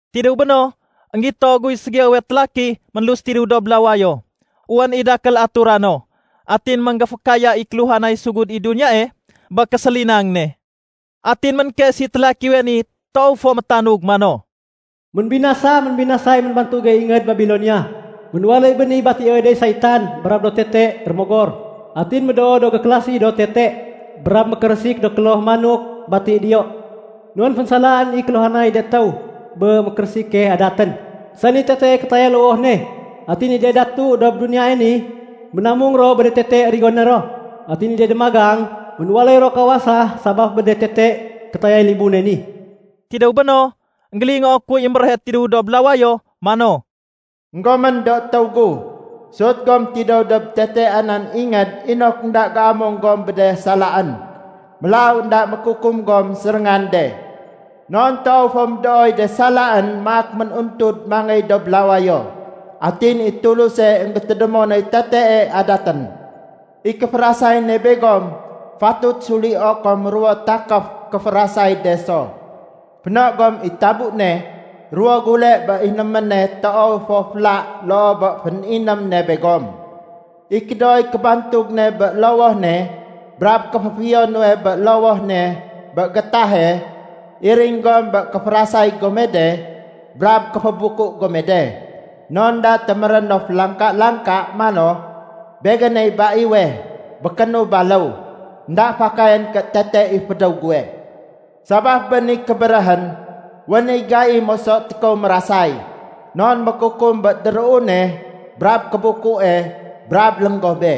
Tidéw béno, énggito guy ségiyowe télaki ménlus tidéw dob lawayo. Wén i dakél atura no. Atin ménggéfékaya i kéluhanay sugud i duniyae bé késélinang ne. Atin ménkes i télakiwe ni toow fo métanug mano, “Ménbinasa! Ménbinasay ménbantuge ingéd Babilonia. Ménwaléy béni batioy de saitan brab do tete do rémogor. Atin médoo do gékélasi do tete brab mékérésik do kloh manok bati diyo. Non fénsalaén i kéluhanay de étéw bé mékérésike adatén, sani tetee kétayay lowoh ne. Atin i de datu dob duniyae ni ménamung ro bé de tete rigoné ro. Atin i de démagang ménwaléy ro kawasa sabaf bé de tete kétayay libune ni.” Tidéw béno, énggélingoo kuy émbéréhe tidéw dob lawayo mano, “Enggomén do étéw gu. Sut gom tidéw dob tete anan ingéd inok énda géamung gom bé de salaén. Mélaw énda mékukum gom séréngan de. Non toow fo médooy de salaén maak mén-untud mangéy dob lawayo. Atin i Tuluse énggétédémo noy tetee adatén. I kéférasay ne begom, fatut sulio kom ruwo takéf kéférasay de so. Féno gom i tabu ne ruwo gule bé inéméne toow fo féla loo bé féniném ne begom. I kédooy kébantug ne bé lowoh ne brab kéféfiyo nuwe bé lowoh ne bé gétahe, iring gom bé kéférasay gome de brab kéfébuku gome de. Non énda téméré no félangka-langka mano, ‘Begéney baiwe, békénu baléw. Enda fakayén ké tete i fédéw guwe.’ Sabaf bé ni kébéréhén, wén i gai moso tékow mérasay. Non mékukum bé déruune brab kébukue brab lénggobe.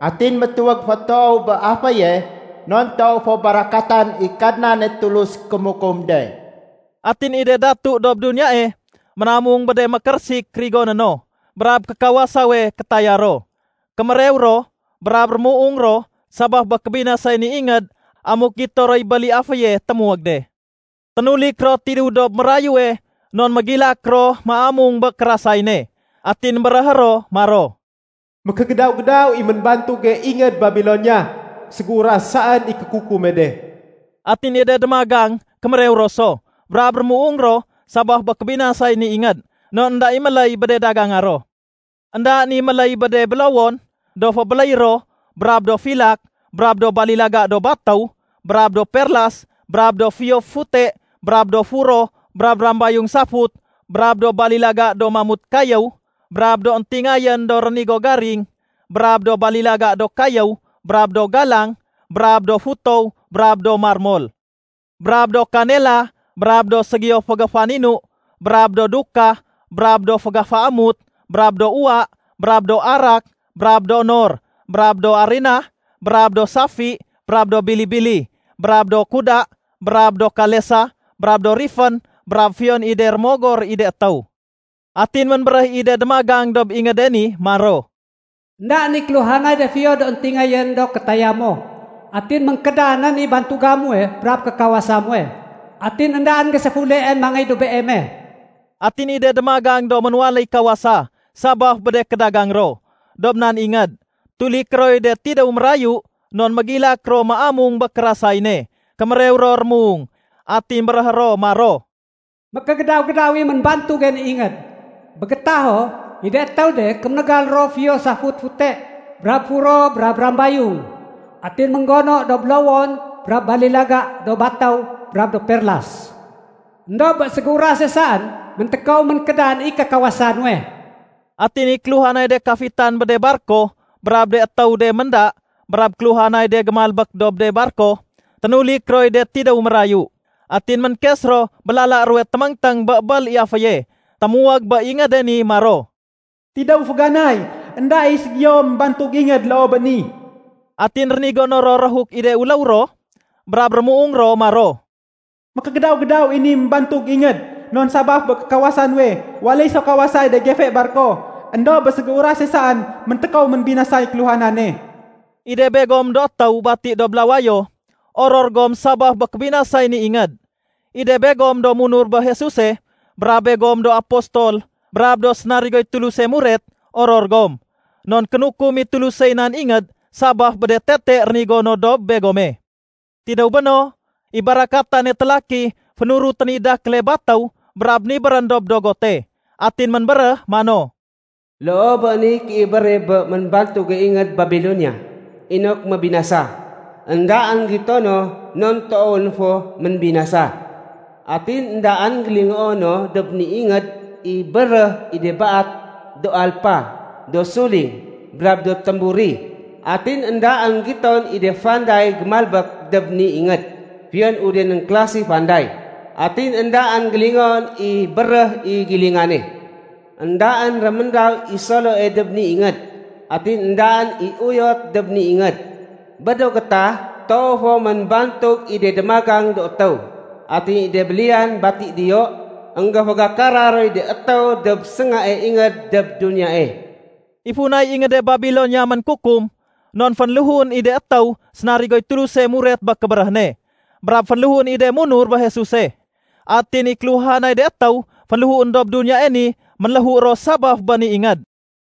Atin métuwég fo toow bé aféye non toow fo barakatan i Kadnane Tulus kémukum de.” Atin i de datu dob duniyae ménamung bé de mékérésik rigoné no brab kékawasawe kétaya ro, kémérew ro, brab rémuung ro sabaf bé kébinasay ni ingéd amuk gito roy bél i aféye témuwég de. Ténulik ro tidéw dob mérayue non mégilak ro méamung bé kérasay ne. Atin béréhé ro maro, “Mékégédaw-gédaw i ménbantuge ingéd Babilonia. Ségéuras saén i kékukume de.” Atin i de démagang kémérew ro so brab rémuung ro sabaf bé kébinasay ni ingéd non énda i méléy bé de daganga ro. Endaén i méléy bé de bélowon do fébéléy ro brab do filak, brab do balilaga do batéw, brab do perlas, brab de fiyo fute brab do furo brab rambayung safut, brab do balilaga do mamut kayéw, brab do éntingayén do rénigo garing, brab do balilaga do kayéw, brab do galang, brab do futow, brab do marmol, brab do kanela brab do ségiyo fégéfaninu, brab do dukah, brab do fégéféamut, brab do uwa, brab do arak, brab do nor, brab do arinah, brab do safi, brab do bili-bili, brab do kuda, brab do kalesa, brab do rifén, brab fiyon i de rémogor i de étéw. Atin ménbéréh i de démagang dob ingéde ni maro, “Endaén i kéluhanay de fiyo do éntingayén do kétaya mo. Atin ménkédanén i bantuga muwe brab kékawasa muwe. Atin éndaén géséfuleén mangéy dob beeme.” Atin i de démagang do ménwaléy kawasa sabaf bé de kédagang ro, dob nan ingéd, tuliké roy de tidéw mérayu non mégilak ro méamung bé kérasay ne. Kémérew ro rémuung. Atin béréhé ro maro, “Mékégédaw-gédaw i ménbantuge ni ingéd. Bé gétaho i de étéw de kéménégal ro fiyo safut fute brab furo brab rambayung. Atin ménggono do bélowon brab balilaga do batéw brab do perlas. Endob bé ségéurase saén méntékow ménkédan i kékawasa nuwe.” Atin i kéluhanay de kafitan bé de barko brab de étéw de ménda brab kéluhanay de gémalbék dob de barko, ténulik roy de tidéw mérayu. Atin ménkes ro bé lala ruwe téméngténg bé bél i aféye témuwég bé ingéde ni maro, “Tidéw féganay, énda i ségiyo ménbantug ingéd loo bé ni!” Atin rénigono ro réhuk i de uléw ro brab rémuung ro maro, “Mékégédaw-gédaw i ni ménbantug ingéd! Non sabaf bé kékawasa nuwe, waléy so kawasay de gefe barko. Endob bé ségéurase saén méntékow ménbinasay kéluhanane.” I de begom do étéw bati dob lawayo, oror gom sabaf bé kébinasay ni ingéd. I de begom do munur bé Jesuse, brab begom do apostol brab do sénarigoy Tuluse muret, oror gom. Non kénukum i Tulusey nan ingéd sabaf bé de tete rénigo no dob begome. Tidéw béno, i barakatane télaki fénurutén i dakéle batéw brab nibérén dob dogote. Atin ménbéréh mano, “Loo bé niy kéibére bé ménbantuge ingéd Babilonia inok mébinasa. Endaén gito no non toowén fo ménbinasa. Atin éndaén gélingoo no dob ni ingéd i béréh i de baat do alpa, do suling, brab do témburi. Atin éndaén giton i de fanday gémalbék dob ni ingéd fiyon udenén klasi fanday, atin éndaén gélingoon i béréh i gilingane. Endaén réméndaw i soloe dob ni ingéd. Atin éndaén i uyot dob ni ingéd. Bé do gétah, toow fo ménbantug i de démagang do étéw. Atin i de béliyan bati diyo, énggéfégakara roy de étéw dob séngae ingéd dob duniyae.” I funay ingéde Babilonia ménkukum, non fénléhuén i de étéw sénarigoy Tuluse muret bé kébéréh ne brab fénléhuén i de munur bé Jesuse. Atin i kéluhanay de étéw fénléhuén dob duniyae ni ménléhu ro sabaf bé ni ingéd.